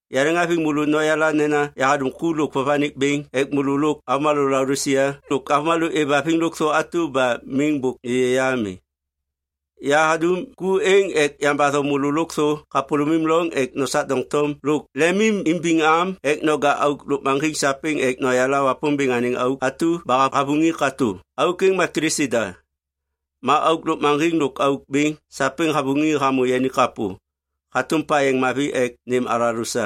Yaleŋhaviŋ môlô noyala nena yahadum ku lôk vovanik bêŋ ek môlô lôk avômalô Laodisia lôk avômalô êvhaviŋ lôkthô atu ba miŋ bôk êyê ya ami. Yahadum ku êŋ ek yambatho môlô lôkthô kapôlômim loŋ ek nosak doŋtom lôk lemimbiŋ am ek noja auk lôkmaŋgiŋ sapêŋ ek noyala Wapômbêŋ anêŋ auk atu ba havuŋi katô. Auk êŋ ma Kilisi da. Ma auk lôkmaŋgiŋ lôk auk bêŋ sapêŋ havuŋi hamô yani kapô hatôm payeŋ mavi ek nêm alalô sa.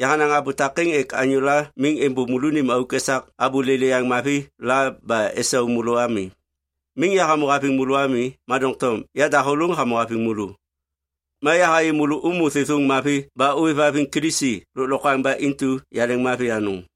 Yahanaŋ abô takêŋ ek anyôla miŋ êmbôv môlônim auk esak abô lêlêyaŋ mavi la ba esau môlô ami. Miŋ yahamô haviŋ môlô ami, ma doŋtom yadahôlôŋ hamô haviŋ môlô. Ma yahayê môlô ômô thêthôŋ mavi ba ôêvhaviŋ Kilisi lôklokwaŋ ba intu yaleŋmavi anôŋ.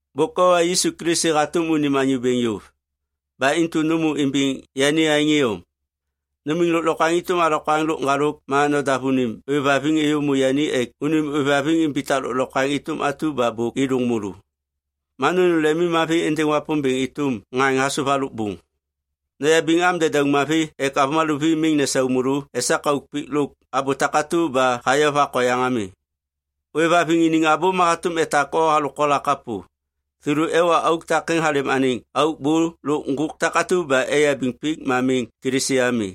Bôk owa Yisu Kilisi hatôm unim Anyô Bêŋ yôv. Ba intu nômô imbiŋ yani aêŋ iyom. Numiŋ lôklokwaŋ êtôm alokwaŋ lôk ŋgalôk ma nodav unim ôêvhaviŋ êyômô yani ek unim ôêvhaviŋ imbitak lôklokwaŋ êtôm atu ba bôk êdôŋ môlô. Ma nônêm lemimmavi êndêŋ Wapômbêŋ êtôm ŋaŋ hasôv halôk bôŋ. Noyabiŋ am dedauŋ mavi ek avômalô vi miŋ nesau môlô esak auk pik lôk abô takatu ba hayovak oyaŋ ami. Ôêvhaviŋ iniŋ abô ma hatôm etak o halôk kola kapô. Thêlô ewa auk takêŋ halêm anêŋ auk bô lôk ŋgôk takatu ba eyabiŋ pik ma miŋ Kilisi ami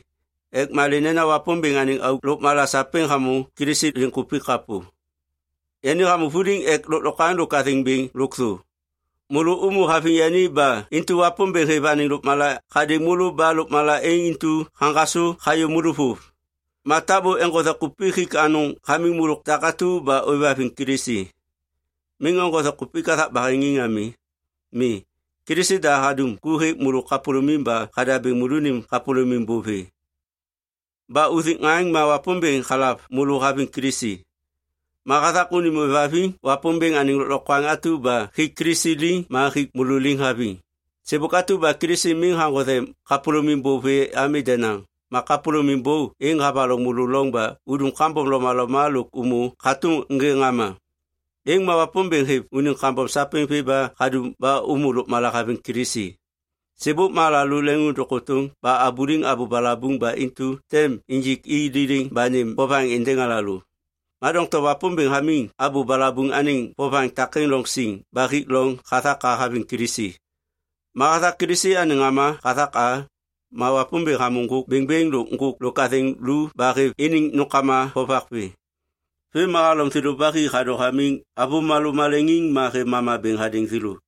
ek malê nena Wapômbêŋ anêŋ auk lôkmala sapêŋ hamô Kilisi liŋkupik kapô. Yani hamô vuliŋ ek lôklokwaŋ lôk athêŋ bêŋ lôkthô. Môlô ômô haviŋ yani ba intu Wapômbêŋ hêv anêŋ lôkmala hadêŋ môlô ba lôkmala êŋ intu haŋgasô hayô môlô vôv. Ma tabô eŋgothe kupik hik anôŋ hamiŋ môlô takatu ba ôêvhaviŋ Kilisi. Miŋ eŋgothe kupik hathak baheŋiŋ ami. Mi, Kilisi da hadum ku hêk môlô kapôlômim ba hadabêŋ môlônim kapôlômim bô vê. Ba uthik ŋaŋ ma Wapômbêŋ halav môlô haviŋ Kilisi. Ma hathak unim ôêvhaviŋ Wapômbêŋ anêŋ lôklokwaŋ atu ba hik Kilisi liŋ ma hik môlô liŋ haviŋ. Sêbôk atu ba Kilisi miŋ haŋgothe kapôlômim bô vê ami denaŋ, ma kapôlômim bô êŋ havaloŋ môlô loŋ ba udum kambom lomaloma lôk ômô hatôm ŋê ŋama. Êŋ ma Wapômbêŋ hêv unim kambom sapêŋ vê ba hadum ba ômô lôkmala haviŋ Kilisi. Sêbôk ma alalô leŋiŋôndôŋ kôtôŋ ba abuliŋ abô balabuŋ ba intu tem injik i liliŋ ba nêm vovaŋ êndêŋ alalô. Ma doŋtom Wapômbêŋ hamiŋ abô balabuŋ anêŋ vovaŋ takêŋ loŋ siŋ ba hik loŋ hathak a haviŋ Kilisi. Ma hathak Kilisi anêŋ ŋama hathak a, ma Wapômbêŋ hamô ŋgôk bêŋbêŋ lôk ŋgôk lôk athêŋ lu ba hêv iniŋ nômkama vovak vê. Vêm ma halom thêlô ba hi hadô hamiŋ avômalô maleŋiŋ ma hêv mama bêŋ hadêŋ thêlô.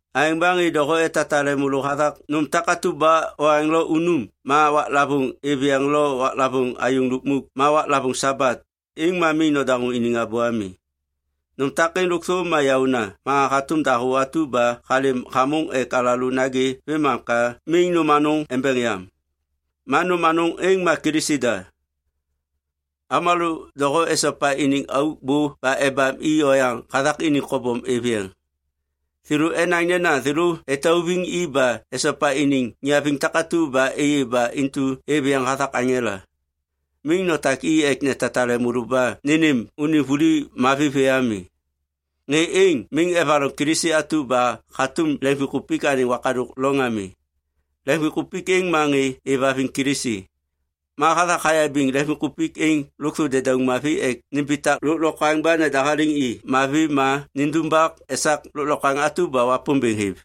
Aêŋ ba ŋê doho etatale môlô hathak nôm takatu ba oaŋ lo unum ma waklavôŋ ôêv yeŋ lo waklavôŋ ayôŋ lukmuk ma waklavôŋ Sabat, êŋ ma miŋ nodaŋô iniŋ abô ami. Nôm takêŋ lôkthô ma yaôna ma hatôm dahô atu ba halêm hamôŋ ek alalô nagê vêmam ka miŋ nôm anôŋ embeŋ yam. Ma nôm anôŋ êŋ ma Kilisi da. Avômalô doho esopa iniŋ auk bô ba ebam i oyaŋ hathak iniŋ kobom êv yeŋ. Thêlô enaŋ nena thêlô etauviŋ i ba esopa iniŋ niaviŋ takatu ba êyê ba intu êv yeŋ hathak aŋela. Miŋ notak i ek netatale môlô ba nênêm unim vuli mavi vê ami. Ŋê êŋ miŋ evaloŋ Kilisi atu ba hatôm leŋviŋkupik anêŋ wakadôk loŋ ami. Leŋviŋkupik êŋ ma ŋê êvhaviŋ Kilisi. Ma hathak hayabiŋ leŋviŋkupik êŋ lôkthô dedauŋ mavi ek nimbitak lôklokwaŋ ba nedahaliŋ i mavi ma nindumbak esak lôklokwaŋ atu ba Wapômbêŋ hêv.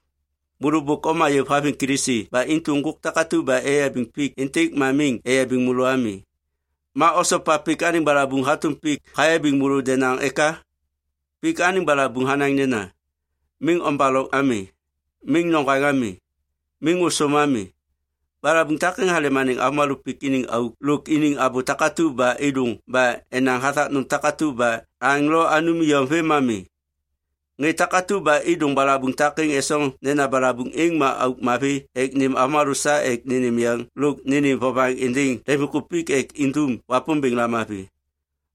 Môlô bôk oma yôv haviŋ Kilisi ba intu ŋgôk takatu ba eyabiŋ pik êntêk ma miŋ eyabiŋ môlô ami. Ma osopa pik anêŋ balabuŋ hatôm pik hayabiŋ môlô denaŋ eka? Pik anêŋ balabuŋ hanaŋ nena, “Miŋ ombaloŋ ami! Miŋ noŋgwaŋ ami! Miŋ ôsôm ami!” Balabuŋ takêŋ halêm anêŋ avômalô pik iniŋ auk lôk iniŋ abô takatu ba êdôŋ ba enaŋ hathak nôm takatu ba aŋ lo anum iyom vêm ma mi. Ŋê takatu ba êdôŋ balabuŋ takêŋ esoŋ nena balabuŋ êŋ ma auk mavi ek nêm avômalô sa ek nênêm yeŋ lôk nênêm vovaŋ êndêŋ leŋviŋkupik ek indum Wapômbêŋ lamavi.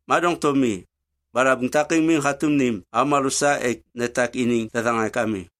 Ma doŋtom mi, balabuŋ takêŋ miŋ hatôm nêm avômalô sa ek netak iniŋ thethaŋak ami.